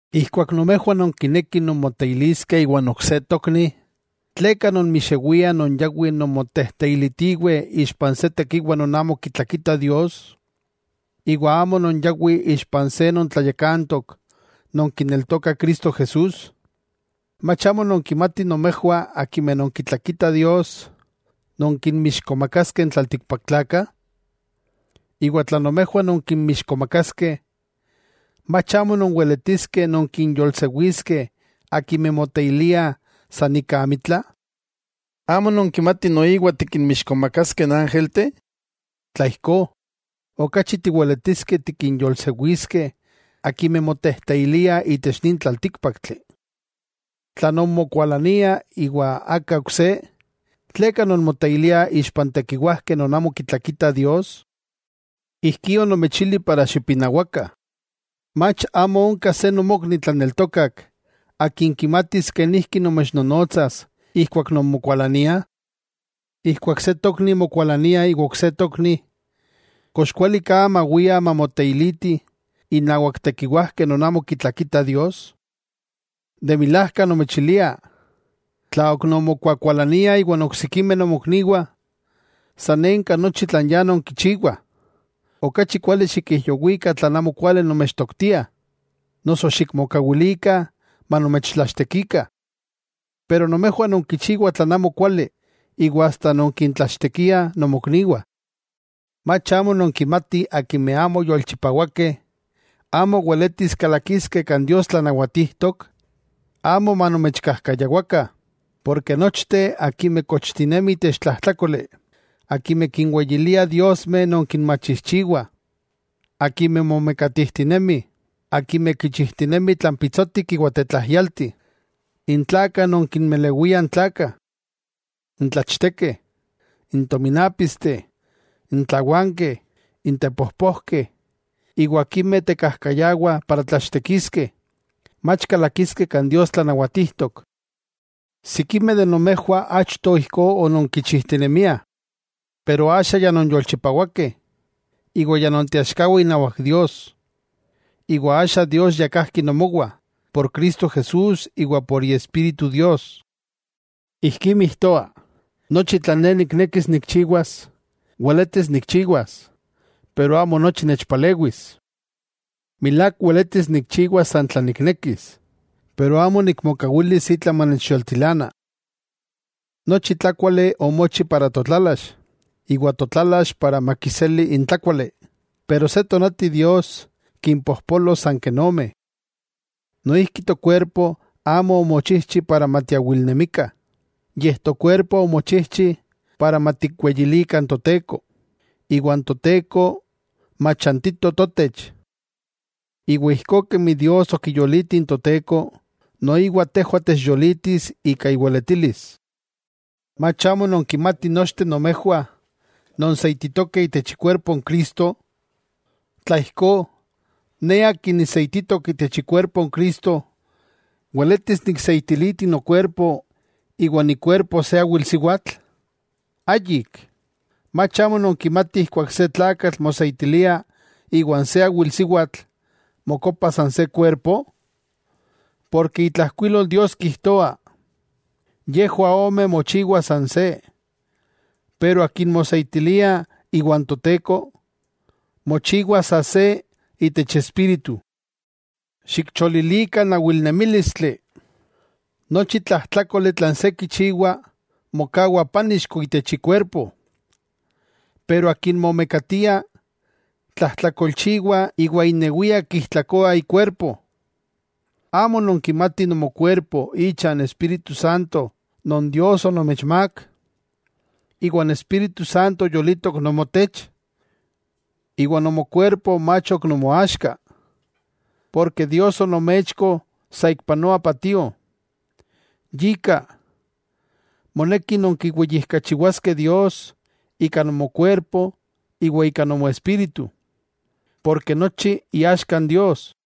Ijkuak nomejwah nonkinekih nonmoteiliskeh iwan ok se tokni, ¿tleka nonmixewiah non yawih nonmotejteilitiweh ixpa se tekiwa non amo kitlakita Dios? Iwa amo non yawi ixpa se non tlayakantok non kineltokah Cristo Jesús. ¿Mach amo nonkimatih nomejwah akimeh nonkitlakitah Dios nonkinmixkomakaskeh n tlaltikpaktlakah? Iwa tla nomejwah nonkinmixkomakaskeh, ¿mach amo nonweletiskeh nonkinyolsewiskeh akimeh moteiliah san ika amitla? ¿Amo nonkimatih noiwa tikinmixkomakaskeh n ángelteh? ¡Tla ijkó, okachi tiweletiskeh tikinyolsewiskeh akimeh motejteiliah itech nin tlaltíkpaktli! Tla nonmokualaniah iwa aka ok se, ¿tleka nonmoteiliah ixpa n tekiwajkeh non amo kitlakitah Dios? Ijkí onomechili para xipinawakah. ¿Mach amo onka se nomokni tlaneltokak akin kimatis kenijki nomechnonotsas ijkuak nonmokualaniah? Ijkuak se tokni mokualania iwa ok se tokni, ¿kox kuali ka mawiah mamoteilitih innawak tekiwajkeh non amo kitlakitah Dios? De milajka, nomechilia, tla ok nonmokuakualaniah iwa n oksikimeh nomokniwah, sanenka nochi tlan ya nonkichiwah. Okachi kuali xikijyowikah tlan amokuali nomechtoktiah, noso xikmokawilikah manomechtlachtekikah. Pero nomejwah nonkichiwah tlan amo kuali iwa asta nonkintlachtekiliah nomokniwah. ¿Mach amo nonkimatih akimeh amo yolchipawakeh amo weletis kalakiskeh kan Dios tlanawatijtok? Amo manomechkajkayawakah; porke nochteh akimeh kochtinemih itech tlajtlákoli, akimeh kinweyiliah diosmeh non kinmachijchiwah, akimeh momekatijtinemih, akimeh kichijtinemih tlan pitsotik iwa tetlajyalti, n tlakah non kinmelewiah n tlakah, n tlachtekeh, n tominápisteh, n tlawankeh, n tepojpojkeh, iwa akimeh tekajkayawah para tlachtekiskeh, mach kalakiskeh kan Dios tlanawatijtok. Sikimeh de nomejwah achto ijkó ononkichijtinemiah. Pero axa ya nonyolchipawakeh, iwa ya nonteaxkawah inawak Dios. Iwa axa Dios ya kajki nomowah, por Cristo Jesús iwa por Iespíritu Dios. Ijkí mijtoa: “Nochi tlan ne niknekis nikchiwas, weletis nikchiwas”, pero amo nochi nechpalewis. Milák weletis nikchiwas san tlan niknekis, pero amo nikmokawilis itla manechyoltilana. Nochi tlákuali omochi para totlalax, iwa totlalax para makiseli n tlákuali, pero se tonati Dios kimpojpolos san ken ome. Noijki tokuerpo amo omochijchi para matiawilnemikah, yej tokuerpo omochijchi para matikweyilikah n Toteko, iwa n Toteko machantito totech. Iwa ijkó kemi Dios okiyoliti n Toteko, noiwa tejwah techyolitis ika iweletilis. ¿Mach amo nonkimatih nochteh nomejwah nonseititokeh itech ikuerpo n Cristo? Tla ijkó, ne akin niseititok itech ikuerpo n Cristo, ¿weletis nikseitiliti nokuerpo iwan ikuerpo se awilsiwatl? ¡Ayik! ¿Mach amo nonkimatih ijkuak se tlakatl moseitilia iwan se awilsiwatl, mokopah san se kuerpo? Porke itlajkuilol Dios kijtoa: “Yejwah ome mochiwa san se.” Pero akin moseitilia iwan Toteko, mochiwa sa se itech espíritu. Xikcholilikah n awilnemílistli. Nochi tlajtlákoli tlan se kichiwa, mokawa pánixko itech ikuerpo, pero akin momekatia, tlajtlakolchiwa iwa inewia kijtlakoa ikuerpo. ¿Amo nonkimatih nomokuerpo icha n Espíritu Santo non Dios onomechmák, iwa n Espíritu Santo yolitok nomotech? Iwa nomokuerpo mach ok nomoaxka, porke Dios onomechko saikpanoa patio. Yika, moneki nonkiweyijkachiwaskeh Dios ika nomokuerpo iwa ika nomoespíritu, porke nochi iaxka n Dios.